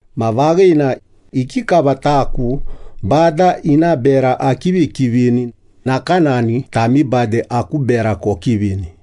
Ma vaghina, ikikava taku Bada ina bera akivikivini, nakanani tami bade aku bera kokivini.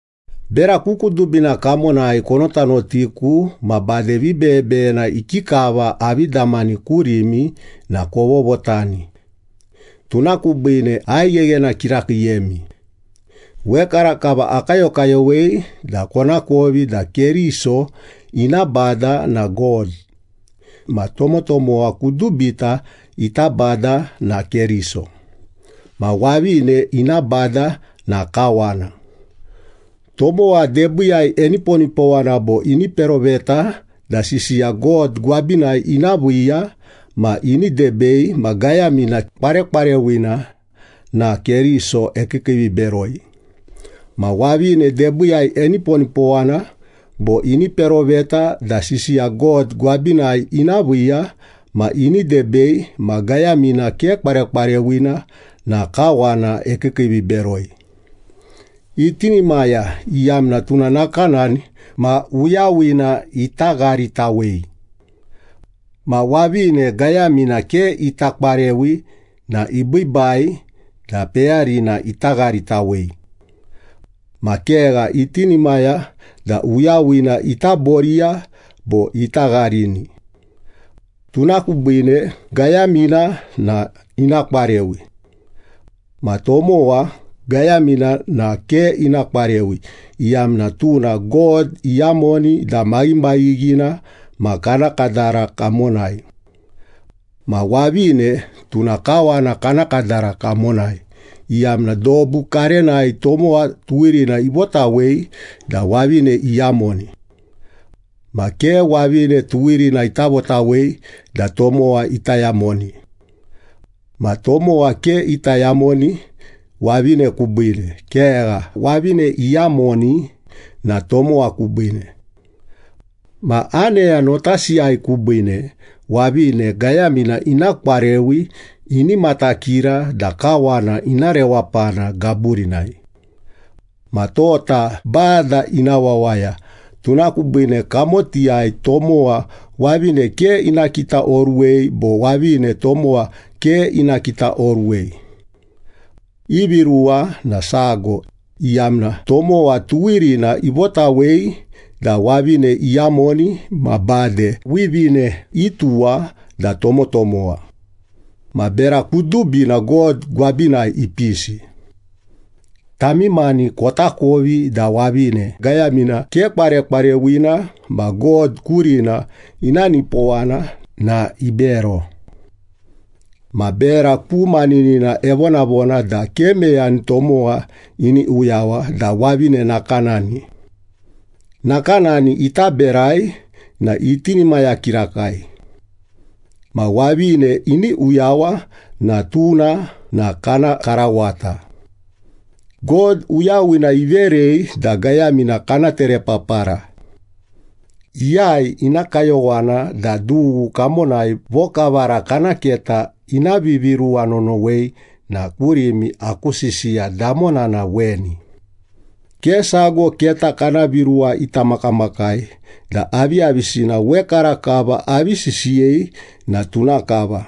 Bera ku kudubina kamonai konotanotiku ma bade vibeyebeyena ikikava avi damani kurimi na kovovotani, tuna kubiine aigheghena kirakiiyemi. Wekarakava akayokayowei da konakovi da Keriso ina Bada na God. Ma tomotomowa kudubita ita Bada na Keriso. Ma wavine ina bada na kawana. Tomowa debiiyai eniponipowana bo ini peroveta da sisiya God gwabinai ina viiya ma ini debei ma gayamina kwarekwarewina na Keriso ekiikiiviberoi. Ma wavine debiiyai eniponipowana bo ini peroveta da sisiya God gwabinai ina viiya ma ini debei ma gayamina ke kwarekwarewina na kawana ekiikiiviberoi. Itinimaya, iyamna tuna nakanani ma uyawina ita gharitawei. Ma wavine gayamina ke ita kwarewi na ibiibai da peyarina ita gharitawei. Ma kegha, itinimaya da uyawina ita boriya bo ita gharini. Tuna kubiine gayamina na ina kwarewi. Ma tomowa gayamina na ke ina kwarewi, iyamna tuna God iyamoni da maghimaghighina ma kana kadara kamonai. Ma wavine tuna kawana kana kadara kamonai, iyamna dobu karenai tomowa tuwirina ivotawei da wavine iyamoni. Ma ke wavine tuwirina ita votawei da tomowa ita yamoni. Ma tomowa ke ita yamoni wavine kubiine, kegha, wavine iyamoni na tomowa kubiine. Ma aneya notasiyai kubiine, wavine gayamina ina kwarewi, ini matakira da kawana ina rewapana gaburinai. Ma tota Bada ina wawaya, tuna kubiine kamotiyai tomowa wavine ke ina kitaoruwei bo wavine tomowa ke ina kitaoruwei. Ivi ruwa na sago, iyamna tomowa tuwirina ivotawei da wavine iyamoni ma bade wivine ituwa da tomotomowa. Ma bera kudubina God gwabinai ipisi. Tami mani kotakovi da wavine gayamina ke kwarekwarewina ma God kurina ina nipowana na ibero. Ma bera ku maninina evonavona da ke meyani tomowa ini uyawa da wavine nakanani. Nakanani ita berai na itinimaya kirakai. Ma wavine ini uyawa na tuna na kana karawata. God uyawina iverei da gayamina kana terepapara. Iyai ina kayowana da dughu kamonai vokavara kana keta ina viviruwa nonowei na kurimi aku sisiya damona na weni. Ke sago keta kana viruwa ita makamakai da aviyavisina wekarakava avi sisiyei na tuna kava.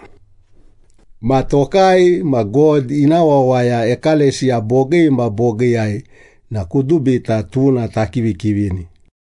Ma tokai ma God ina wawaya ekalesiya bogii ma bogiiyai na kudubita tuna takivikivini.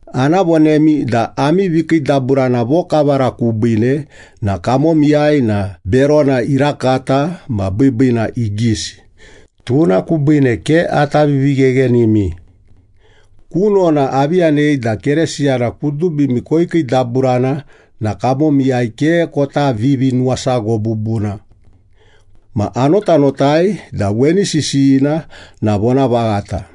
Ana vonemi da ami vikiidaburana vokavara kubiine na kamonai na berona irakata ma biibiina igisi, tuna kubiine ke ata vivigheghenimi. Kunona, avi yanei da Keresiyana kudubimi koikiidaburana na kamomiyai ke kota vivinuwasago bubuna. Ma anotanotai da weni sisiyina na vonavaghata.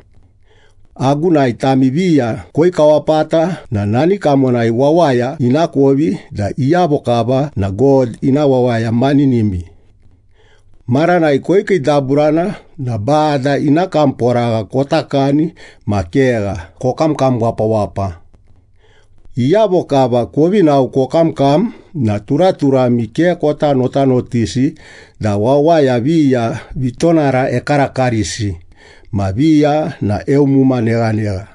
Agunai tami viya koikawapata na nani kamonai wawaya inakovi da iyavo kava na God ina wawaya maninimi. Maranai koikiidaburana na Bada ina kamporagha kota kani ma kegha, kokamkam wapawapa. Iyavo kava kovi nao kokamkam na turaturami ke kota notanotisi da wawaya viya vitonara ekarakarisi. Ma viya na eumuma neghanegha.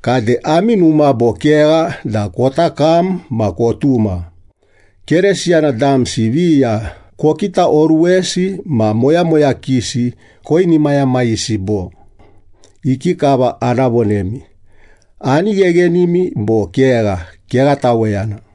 Kade ami numa bo kegha da kota kam ma kotuma? Keresiyana damsi viya kokitaoruwesi ma moyamoyakisi koinimayamayisi bo? Ikikava ana vonemi? Ani gheghenimi bo kegha? Kegha taweyana!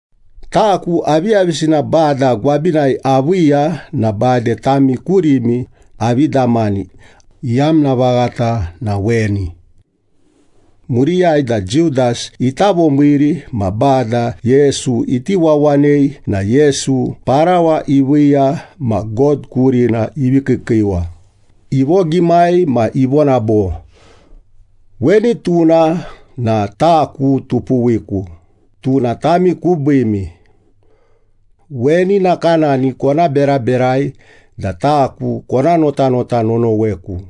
Taku aviyavisina Bada gwabinai aviiya na bade tami kurimi avi damani, iyamna vaghata na weni. Muriyai da Judas ita vomiiri ma Bada Yesu iti wawanei na Yesu parawa iviiya ma God kurina ivi kiikiiwa, ivogimai ma ivona bo, “Weni tuna na taku tupuwiku, tuna tami kubiimi. Weni nakanani kona beraberai da taku kona notanota nonoweku.”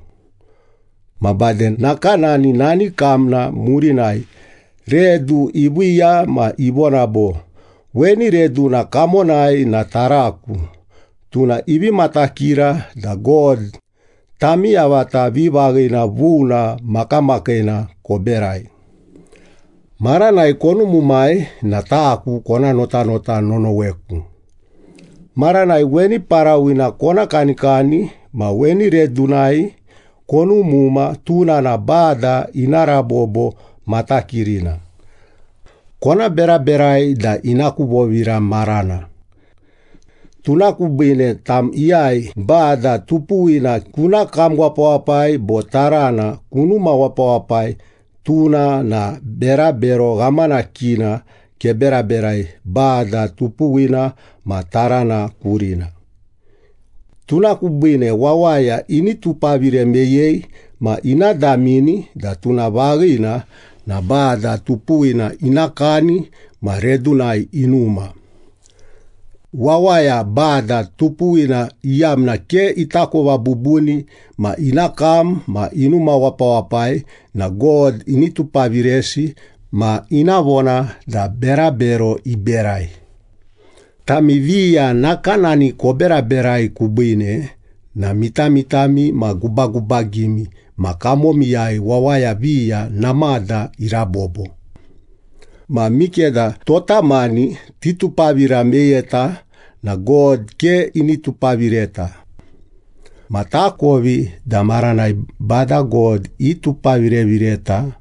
Ma bade nakanani nani kamna murinai, redu iviiya ma ivona bo, “Weni reduna kamonai na taraku, tuna ivi matakira da God tami yavata vivaghina vuna makamakiina koberai. Maranai konumumai na taku kona notanota nonoweku.” Maranai weni parawina kona kanikani ma weni redunai konumuma, tuna na Bada ina rabobo matakirina. Kona beraberai da ina ku vovira marana. Tuna kubiine tam iyai Bada tupuwina kuna kam wapawapai bo tarana kunuma wapawapai, tuna na berabero ghamanakina keberaberai Bada tupuwina ma tarana kurina. Tuna kubiine wawaya ini tupavire meyei ma ina damini da tuna vaghina na Bada tupuwina ina kani ma redunai inuma. Wawaya, Bada tupuwina iyamna ke itakova bubuni ma ina kam ma inuma wapawapai na God ini tupaviresi ma ina vona da berabero iberai. Tami viya nakanani koberaberai kubiine na mitamitami ma gubagubagimi ma kamomiyai wawaya viya namada irabobo. Ma mikeda tota mani titupavira meyeta na God ke ini tupavireta. Ma takovi da maranai Bada God itupavirevireta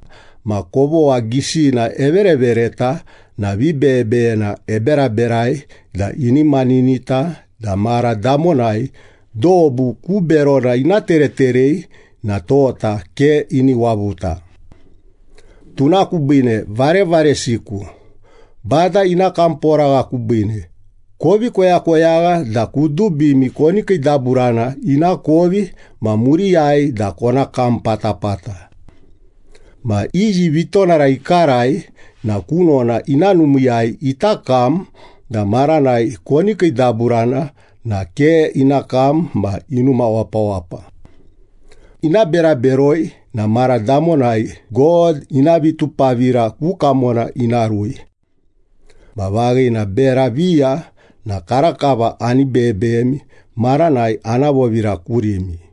ma kovogha gisina everevereta na vibeyebeyena eberaberai da ini maninita da mara damonai dobu ku berona ina tereterei na tota ke ini wavuta. Tuna kubiine varevaresiku, Bada ina kamporagha kubiine kovi koyakoyagha da kudubimi koni kiidaburana ina kovi ma muriyai da kona kam patapata. Ma iyi vitonara ikarai na kunona ina numiiyai ita kam, da maranai koni kiidaburana na ke ina kam ma inuma wapawapa. Ina bera beroi na mara damonai God ina vitupavira ku kamona ina rui. Ma vaghina, bera viya na karakava ani beyebeyemi maranai ana vovira kurimi.